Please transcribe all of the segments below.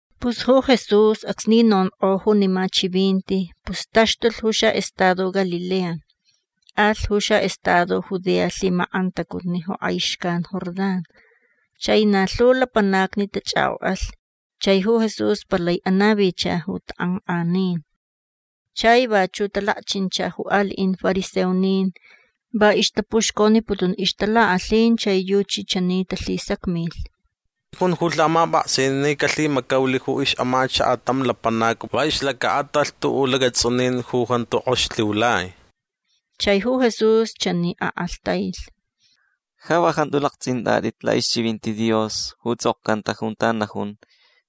Pus ju Jesús acsni nonk'o junima chivinti pus taxtulh ju xa'estado Galilea. Alh ju xa'estado Judea lhimak'antacutni ju k'ai xcan Jordán. Chai na lhu lapanacni tach'ak'ok'alh chai ju Jesús palai anavicha ju tak'ank'anin. Chai vachu' talakchincha ju ali'in fariseonin. Va ixtapuxconiputun ixtalak'alhin chai yuchi chani talhisacmilh: ―Ja lhijun ju lhamap'aksin ni calhimacaulh ju ix'amachaka' tam lapanac va ixlaca'atalh tu'u' lacats'unin ju jantu k'ox lhiulai. Chai ju Jesús chani ak'alhtailh: ―Ja va jantu lakts'int'at'it la'ixchivinti Dios ju ts'okcanta junta najun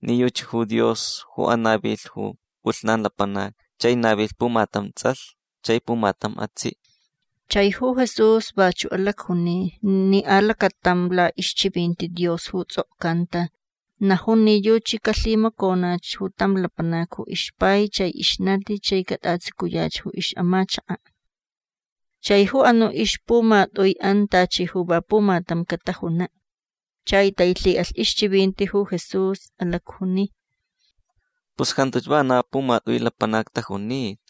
ni yuchi ju Dios ju anavilh ju p'ulhnan lapanacni. Chai navilh pumatam ts'alh chai pumatam atsi'. Chai ju Jesús vachu' alacjuni ni alacatam la'ixchivinti Dios ju ts'okcanta najun ni yuchi calhimaconach ju tam lapanac ju ixpai chai ixnati chai cat'atsucuyach ju ix'amachaka'. Chai ju anu' ixpumat'ui'an tachi ju va pumatam catajuna'. Chai tailhi'alh ixchivinti ju Jesús. Alacjuni: ―Pus jantuch vana pumat'ui lapanacni tajunita.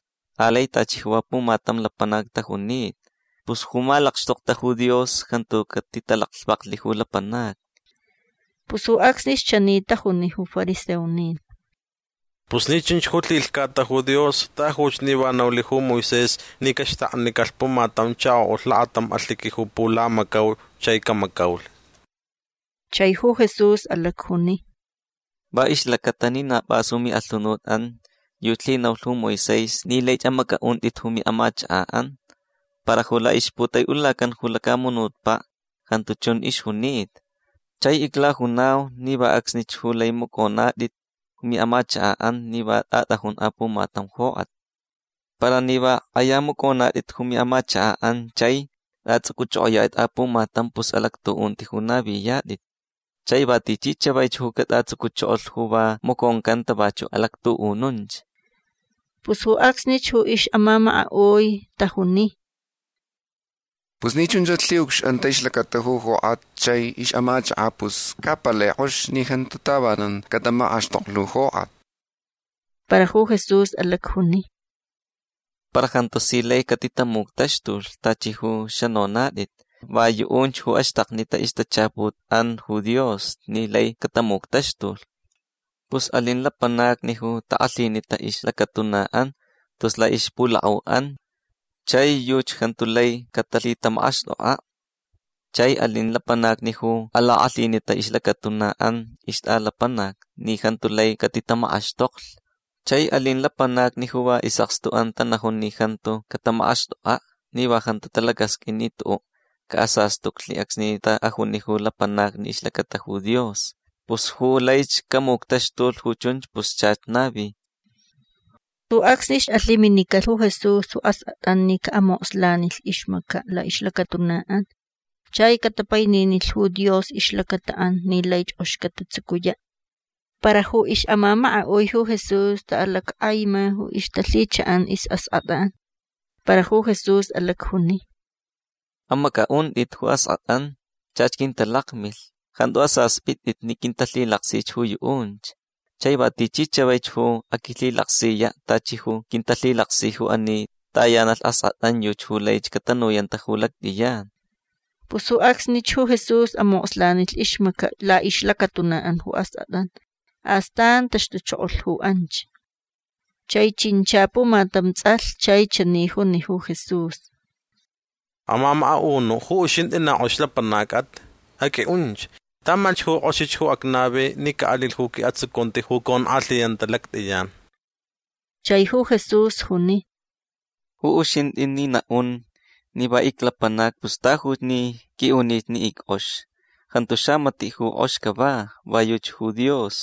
Alai tachi va pumatam lapanac tajunita. Pus ju malakxtokta ju Dios jantu catitalaclhvaklh ju lapanacni. Pus ju acsnich chani tajuni ju fariseonin: ―Pus ni chunch ju lhilhcata ju Dios tajuch ni va naulh ju Moisés ni caxtaknicalh pumatam chako'ulh lakatam alhiqui ju pulamacau chai camacaulh. Chai ju Jesús alacjuni: ―Va ixlacata ni na p'as ju mi'alhunut'an yuchi lhinaulh ju Moisés ni laich amac'a'unt'it ju mi'amachaka'an. Para ju la'ixputai'ulacan ju lacamunutpa' jantu chun ixjunita. Chai iclajunau ni va acsnich ju lai mac'onat'it ju mi'amachaka'an ni va t'at'ajun apumatam jok'at. Para ni va k'aya mac'onat'it ju mi'amachaka'an chai t'ats'uc'uch'ok'oya'it'it apumatam pus alactu'unti ju naviyat'it. Chai va tichi chavaich ju cat'atsucuchokolh ju va maconcanta vachu' alactu'ununch. Pus ju acsnich ju ix'amamaka'ui tajuni: ―Pus ni chunchach lhi'ucx'anta ixlacata ju jok'at chai ix'amachaka' pus ca palai k'ox ni jantu tavanan catamak'axtoklh ju jok'at. Para ju Jesús alacjuni: ―Para jantu si lai catitamuctaxtulh tachi ju xanonat'it. Va yu'unch ju axtaknita ixtachaput'an ju Dios ni lai catamuctaxtulh. Pus alin lapanacni ju tak'alhinita ixlacatuna'an tus la'ixpulak'au'an chai yuchi jantu lai catalhitamak'axt'ok'a'. Chai alin lapanacni ju alak'alhinita ixlacatuna'an ixt'alapanac ni jantu lai catitamak'axtoklh. Chai alin lapanacni ju va is'akstu'an tanajun ni jantu catamak'axt'ok'a' ni va jantu talacasq'uin ni tu'u' ca'asastuclh acsni ta'ajuni ju lapanacni ixlacata ju Jesús. Pus ju laich camuctaxtulh ju chunch pus chach navi. Ju acsnich alhiminicalh ju Jesús ju ask'at'an ni ca'amokslanilh ixmaca' la'ixlacatuna'an chai catapaininilh ju Dios ixlacata'an ni laich k'ox catatsucuya'. Para ju ix'amamaka'ui ju Jesús ta'alack'aima ju ixtalhicha'an is'ask'at'an. Para ju Jesús alacjuni: ―Amac'a'unt'it ju ask'at'an. Chach quintalakmilh. Jantu asasp'it'it ni quintalhilaksich ju yu'unch. Chai va tichi chavaich ju aquilhilaksiya' tachi ju quintalhilaksi ju ani tayanalh ask'at'an yuchi ju laich catanuyanta ju lact'iyan. Pus ju acsnich ju Jesús amokslanilh ixmaca' la'ixlacatuna'an ju ask'at'an. Astan taxtuchokolh ju anch. Chai chincha pumatam ts'alh chai chani juni ju Jesús: ―Amamaka'unu' ju uxint'i na k'ox lapanac'at. Aq'ui'unch. Tamalhch ju k'oxich ju acnavi ni ca'alilh ju qui'atsucunti ju conk'alhiyanta ju lact'iyan. Chai ju Jesús juni: ―Ju uxint'i ni na'un ni va iclapanac pus tajuch ni q'ui'unich ni ick'ox. Jantu xamati' ju k'ox cava. Va yuchi ju Dios.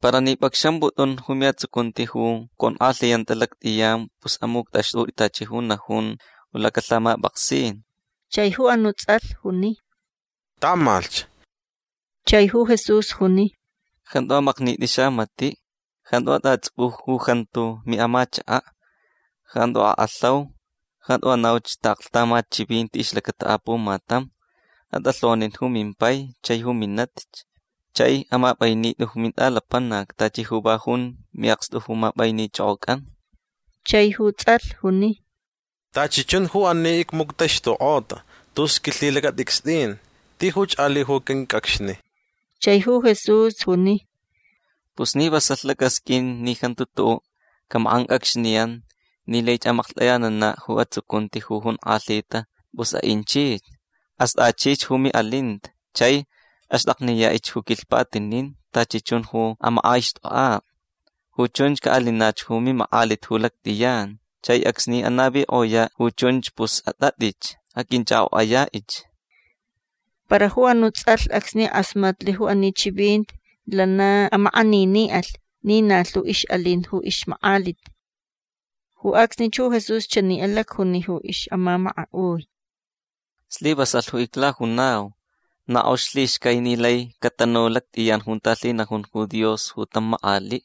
Para ni p'acxamp'ut'un ju mi'atsucunti ju conk'alhiyanta lact'iyan pus amuct'axt'ut'i tachi ju najun lacalhamap'aksin. Chai ju anu' ts'alh juni: ―Tamalhch. Chai ju Jesús juni: ―Jantu amaknit'i xamati'. Jantu at'ats'uc'u ju jantu mi'amachaka'. Jantu ak'alhaun. Jantu anauch ta'aklhtamat chivinti ixlacata apumatam. At'alhonin ju mimpai chai minatich. Chai amap'ainit'i ju mint'alapanac tachi ju va jun mi'akstu ju map'ainich'ok'oc'an. Chai ju ts'alh juni: ―Tachi chun ju ani icmuctaxtuk'ota tus quilhitalacat'icst'in. Tijuch ali' ju quinc'acxni. Chai ju Jesús juni: ―Pus ni vasalh lac'asq'uin ni jantu tu'u' camak'anc'acxniyan ni laich amaklht'ayanana' ju atsucunti ju jonk'alhita pus a'inchich. Ast'achich ju mi'alinta chai axt'akniya'ich ju quilhpatinin tachi chun ju amak'aixt'ok'a'. Ju chunch ca'alinach ju mimak'alit ju lact'iyan. Chai acsni anavik'oya' ju chunch pus at'at'ich. Aq'uinch'ak'ok'aya'ich. Para ju anu' ts'alh acsni k'asmatlh ju ani chivinti lana amak'anini'alh ni na lhu ix'alin ju ixmak'alit. Ju acsnich ju Jesús chani alacjuni ju ix'amamaka'ui: ―Slivasalh ju iclajunau. Na k'ox lhixcai ni lai catanu ju lact'iyan junta lhinajun ju Dios tam mak'ali'.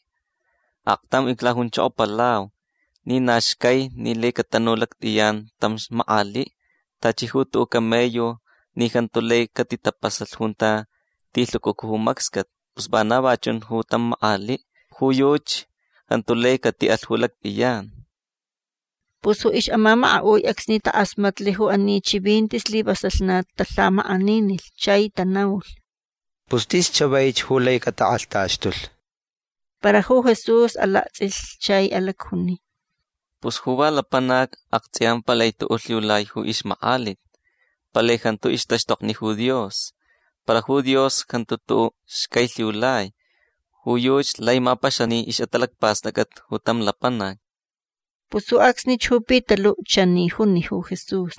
Aktam iclajunchokopalau ni na xcai ni lai catanu lact'iyan tam mak'ali'. Tachi ju tu'u' camello ni jantu lai catitapasalh junta tilhucucu ju macscat pus vana va chun ju tam mak'ali'. Ju yuchi jantu lai cati'alh ju lact'iyan. Pus ju ix'amamaka'ui acsni tak'asmatlh ju ani chivinti slivasalh na talhamak'aninilh. Chai tanaulh: ―Pus tis chavaich ju lai catak'alhtaxtulh. Para ju Jesús alakts'ilh chai alacjuni: ―Pus ju va lapanac akts'iya palai tu'u' lhiulai ju ixmak'alit. Palai jantu ixtaxtokni ju Dios. Para ju Dios jantu tu'u' xcai lhiulai. Ju yuchi lai mapaxani ix'atalacpast'ac'at tam lapanac. Pus ju acsnich ju Pitalu' chani juni ju Jesús: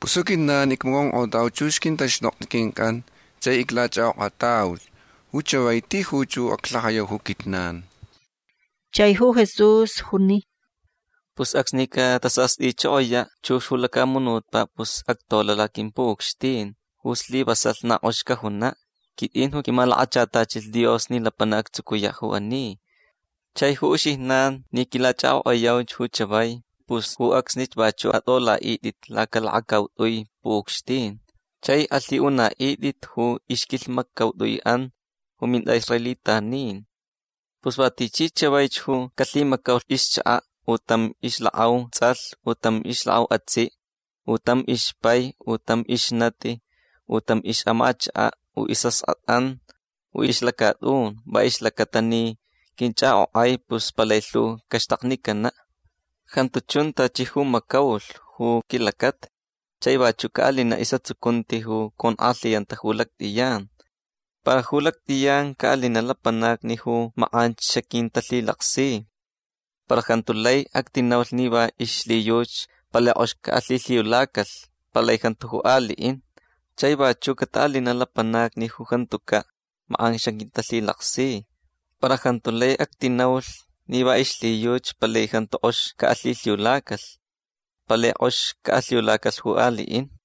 ―Pus ju quijnan icmaconk'otauch chux quintaxtokni quinc'an chai iclach'ak'ok'atauch. Ju chavai tijuch ju aclhajayau ju quijnan. Chai ju Jesús juni: ―Pus acsni catasast'ichokoya' chux ju lacamunutpa' pus actola' laquimpu'ucxtin ju slivasalh na k'ox cajuna'. Quit'in ju quimalakachatachilh Dios ni lapanac actsucuya' ju ani. Chai ju uxijnan ni quilach'ak'ok'ayauch ju chavai pus ju acsnich vachu' at'ola'it'it lacalakacaut'ui pu'ucxtin. Chai alhi'una'it'it ju ixquilhmaccaut'ui'an ju mint'a'israelitanin. Pus va tichi chavaich ju calhimacaulh ju ixchaka' u tam ixlak'au ts'alh u tam ixlak'au atsi' u tam ixpai u tam ixnati u tam ix'amachaka' u is'ask'at'an u ixlacat'un va ixlacata ni quinch'ak'ok'ai pus palai lhu caxtaknicana'. Jantu chun tachi ju macaulh ju quilacata. Chai vachu' ca'alina' is'atsucunti ju conk'alhiyanta ju lact'iyan. Para ju lact'iyan ca'alina' lapanacni ju mak'anch xaquintalhilaksi. Para jantu lai actinaulh ni va ixlhiyuchi palai k'ox ca'alhilhiulacalh. Palai jantu ju ali'in. Chai vachu' cata'alina' lapanacni ju jantuca' mak'an xaquintalhilaksi. Para jantu lai actinaulh ni va ixlhiyuchi palai jantu k'ox ca'alhilhiulacalh. Palai k'ox ca'alhiulacalh ju ali'in.